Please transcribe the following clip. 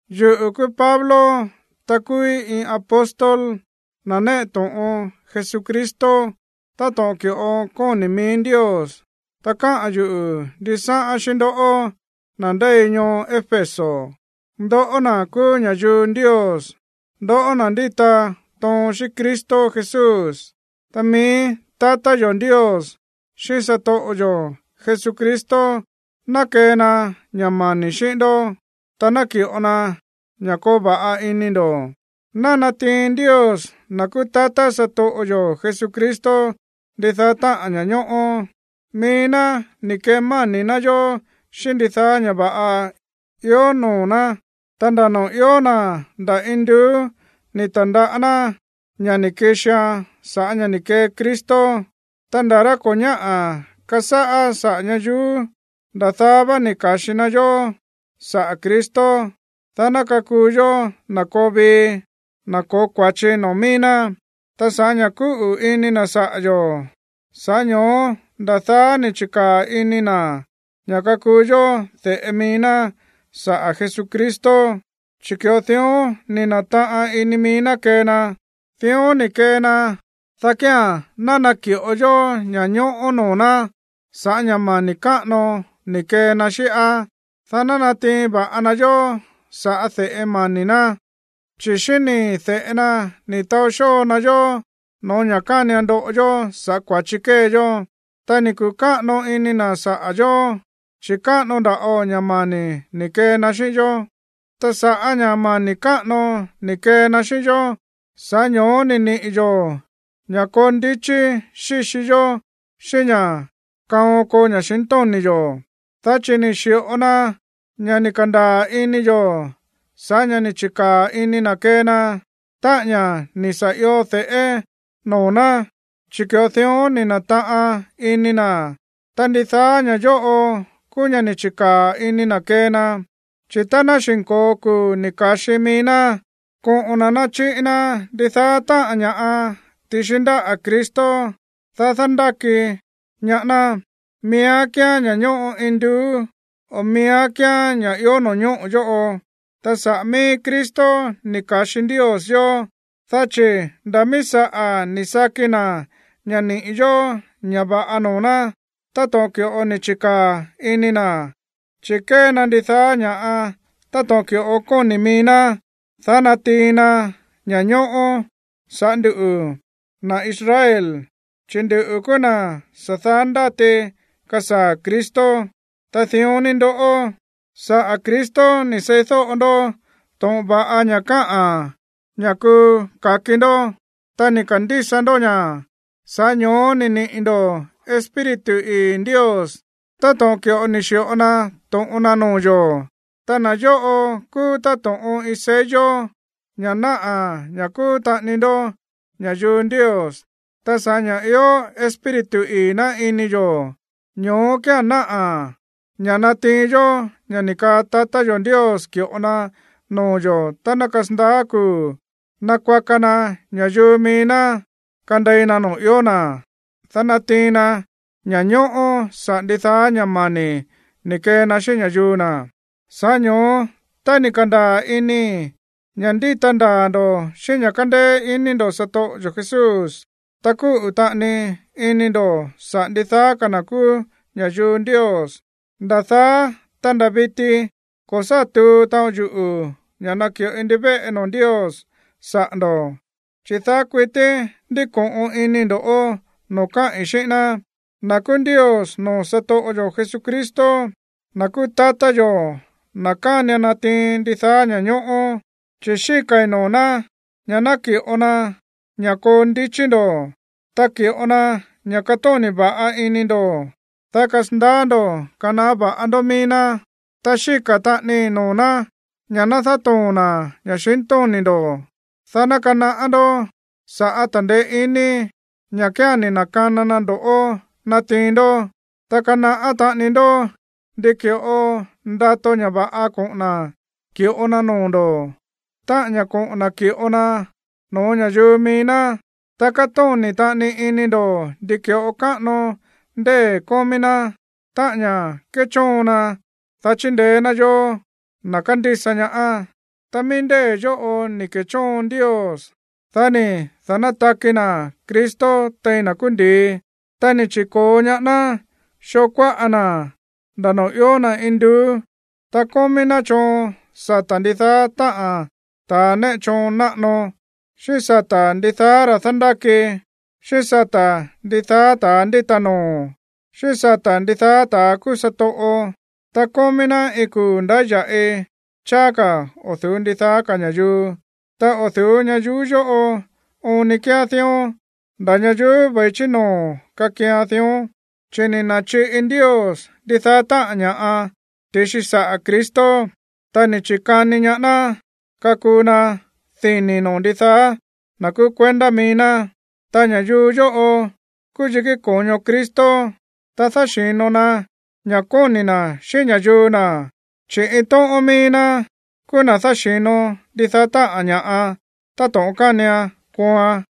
Yuꞌu̱ kúú Pablo, ta kúúí iin apóstol, na̱ néꞌe to̱ꞌon Jesucristo, táto̱ꞌon ki̱ꞌo kóni̱ mií Ndios. Ta káꞌa̱n yuꞌu̱ ndisáꞌán xíꞌín ndoꞌó, na̱ ndéi ñoo Éfeso, ndoꞌó na̱ kúú ña̱yuu Ndios, ndoꞌó na̱ ndíta toon xíꞌín Cristo Jesús. Ta mií tatá yo̱ Ndios xíꞌín satoꞌo yo̱ Jesucristo ná kee na ña̱ mani̱ xíꞌín ndó, ta naki̱ꞌo na ña̱ koo va̱ꞌa ini ndo̱. Ná natiin Ndios, na̱ kúú tatá satoꞌo yo̱ Jesucristo, ndidaá táꞌa̱n ña̱ñóꞌó. Mií ná ni̱ kemáni̱ ná yó xíꞌín ndidaá ña̱ va̱ꞌa ió noo̱ ná, ta nda̱ noo̱ ió na̱ nda̱ induú ni̱ ta̱ndaꞌá ná ña̱ ni̱ kixian sa̱ꞌá ña̱ ni̱ kee Cristo. Ta nda̱ rá ko̱ ñáꞌa̱ kasáꞌá saꞌa̱ ñayuú, nda̱ daá vá ni̱ ka̱xi na yó saꞌa̱ Cristo, dá ná kakuu yó na̱ koo vii, na̱ ko̱ó kua̱chi noo̱ mií ná. Ta sa̱ꞌá ña̱ kúꞌu̱ ini na̱ saꞌa̱ yo̱, sa̱ꞌá ño̱ó nda̱ daá ni̱ chi̱kaa̱ ini na̱ ña̱ kakuu yó de̱ꞌe mií ná saꞌa̱ Jesucristo, chi̱ ki̱ꞌo dión ni̱ na̱taꞌan ini mií ná kee na. Dión ni̱ kee na, dá kía̱n ná naki̱ꞌo yó ña̱ñóꞌó noo̱ ná sa̱ꞌá ña̱ mani̱ káꞌano ni̱ kee na xíꞌá, dá ná natiin va̱ꞌa na yó sa̱ꞌá de̱ꞌe mani̱ ná. Chi̱ xíꞌín nii̱ de̱ꞌe na ni̱ taó xóo na yó no̱ó ña̱ kánian ndoꞌo yó sa̱ꞌá kua̱chi kée yó, ta ni̱ kuꞌu̱ káꞌano ini na̱ saꞌa̱ yo̱, chi̱ káꞌano nda̱ꞌo ña̱ mani̱ ni̱ kee na xíꞌín yó. Ta sa̱ꞌá ña̱ mani̱ káꞌano ni̱ kee na xíꞌín yó, sa̱ꞌá ño̱ó ni̱ niꞌi̱ yo̱ ña̱ koo ndichí xíxi yó xíꞌín ña̱ kaon koo ña̱xintóni̱ yo̱, dá chi̱ ni̱ xi̱ꞌo na ña̱ ni̱ ka̱ndaa̱ ini yo̱ sa̱ꞌá ña̱ ni̱ chi̱kaa̱ ini na̱ kee na, táꞌa̱n ña̱ ni̱ sa̱ io de̱ꞌé noo̱ ná, chi̱ ki̱ꞌo dión ni̱ na̱taꞌan ini na̱. Ta ndidaá ña̱ yóꞌo kúú ña̱ ni̱ chi̱kaa̱ ini na̱ kee na. Chi̱ tá ná xi̱nko̱o kuu̱ ni̱ ka̱xi mií ná, koꞌo̱n na̱ nachiꞌi na ndidaá táꞌa̱n ña̱ꞌa ti̱xi ndáꞌa̱ Cristo, dá dándáki ñaá ná, miíán kíán ña̱ ñóꞌo induú, o miíán kíán ña̱ ió no̱ñóꞌo̱ yóꞌo. Ta saꞌa̱ mií Cristo ni̱ ka̱xi Ndios yóó, dá chi̱ nda̱ míí saꞌa̱ ni̱ saki na̱ ña̱ niꞌi̱ yo̱ ña̱ va̱ꞌa noo̱ ná, táto̱ꞌon ki̱ꞌo ni̱ chi̱kaa̱ ini na̱, chi̱ kée na ndidaá ña̱ꞌa táto̱ꞌon ki̱ꞌo kóni̱ mií ná, dá natiin na ña̱ñóꞌó sa̱ꞌá nduꞌu̱, na̱ Israel, chi̱ nduꞌu̱ kúú na̱ sa̱ daá ndáti kasaa̱ Cristo. Ta dión ni ndoꞌó, saꞌa̱ Cristo ni̱ seídóꞌo ndó to̱ꞌon va̱ꞌa ña̱ káꞌa̱n ña̱ kuu ka̱ki ndó tá ni̱ ka̱ndísa ndó ña̱. Sa̱ꞌá ño̱ó ni̱ niꞌi̱ ndo̱ Espíritu ii̱ Ndios táto̱ꞌon ki̱ꞌo ni̱ xi̱ꞌo na to̱ꞌon na noo̱ yo̱. Ta na̱ yóꞌo kúú táto̱ꞌon iin sello, ña̱ náꞌa̱ ña̱ kúú taꞌani ndó ña̱yuu Ndios. Ta sa̱ꞌá ña̱ ió Espíritu ii̱ ná ini yo̱, ño̱ó kía̱n náꞌa̱ ña̱ natiin yó ña̱ ni̱ kaa tatá yo̱ Ndios ki̱ꞌo na noo̱ yo̱ tá ná kasandaá kuu̱ nakuaka na ña̱yuu mií ná kandei na noo̱ ió na̱, dá natiin na ña̱ñóꞌó saꞌa̱ ndidaá ña̱ mani̱ ni̱ kee na xíꞌín ña̱yuu na̱. Sa̱ꞌá ño̱ó, tá ni̱ ka̱ndaa̱ inii̱ ña̱ ndíta ndaa̱ ndo̱ xíꞌín ña̱ kándéé iní ndo̱ satoꞌo yo̱ Jesús, ta kúꞌu̱ taꞌani ini ndo̱ saꞌa̱ ndidaá ka̱ na̱ kúú ña̱yuu Ndios, nda̱ daá, ta nda̱ viti ko̱ sá tuu taꞌon yuꞌu̱ ña̱ naki̱ꞌoi ndivéꞌe noo̱ Ndios saꞌa̱ ndo̱, chi̱ daá kuití ndíko̱ꞌon inii̱ ndo̱ꞌó noo̱ káꞌi̱n xíꞌín ná, na̱ kúú Ndios noo̱ satoꞌo yo̱ Jesucristo, na̱ kúú tatá yo̱, na̱ kánian natiin ndidaá ña̱ñóꞌó. Chi̱ xíka̱i̱ noo̱ ná ña̱ naki̱ꞌo na ña̱ koo ndichí ndo̱, ta ki̱ꞌo na ña̱ katóni̱ va̱ꞌa ini ndo̱, dá kasandaá ndo̱ kanaꞌá va̱ꞌa ndó mií ná. Ta xíka̱ taꞌanii noo̱ ná ña̱ ná dátoo̱n na̱ ña̱xintóni̱ ndo̱, dá ná kanaꞌá ndó sa̱ꞌá ta̱ndeé iní, ña̱ kía̱n ni̱ na̱kana na ndo̱ꞌó natiin ndó, ta kanaꞌá taꞌani ndó ndi ki̱ꞌo ndato ña̱ va̱ꞌa koꞌo̱n na̱ ki̱ꞌo na noo̱ ndo̱, táꞌa̱n ña̱ koꞌo̱n na̱ ki̱ꞌo na no̱ó ña̱yuu mií ná, ta katóni̱ taꞌani ini ndo̱ ndi ki̱ꞌo káꞌano ndée̱ kómí ná, táꞌa̱n ña̱ kéchóon na, dá chindeé ná yóó, na̱ kándísa ñaá. Ta mií ndée̱ yóꞌo ni̱ ke̱chóon Ndios, dá ni̱ da̱nátaki na̱ Cristo tein na̱ kúú ndi̱i, ta ni̱ chi̱ko̱o ñaá ná xoo kuáꞌa na̱ nda̱ noo̱ ió na̱ induú. Ta kómí ná choon sata̱ ndidaá táꞌa̱n ta̱a néꞌe choon náꞌano, xíꞌín sata̱ ndidaá ta̱ dándáki, xíꞌín sata̱ ndidaá ta̱ ndíta noo̱, xíꞌín sata̱ ndidaá ta̱ kúú satoꞌo. Ta kómí ná iin kuu̱ ndáya̱ꞌi cháá ka̱ o̱ du̱ú ndidaá ka̱ ña̱yuu. Ta o̱ du̱ú ñayuú yóꞌo oon ni kíán dión, nda̱ ñayuú ve̱i chí noo̱ kakian dión. Chi̱ ni̱ na̱chiꞌi Ndios ndidaá táꞌa̱n ña̱ꞌa ti̱xi saꞌa̱ Cristo, ta ni̱ chi̱kani ñaá ná kakuu na dini̱ noo̱ ndidaá na̱ kúú kuendá mií ná. Ta ña̱yuu yóꞌo kúú yikí ko̱ño Cristo, ta dáxi̱no na ña̱ kóni̱ na̱ xíꞌín ña̱yuu na̱, chi̱ iin tóꞌón míí ná kúú na̱ dáxi̱no ndidaá táꞌa̱n ña̱ꞌa táto̱ꞌon kánian kooan.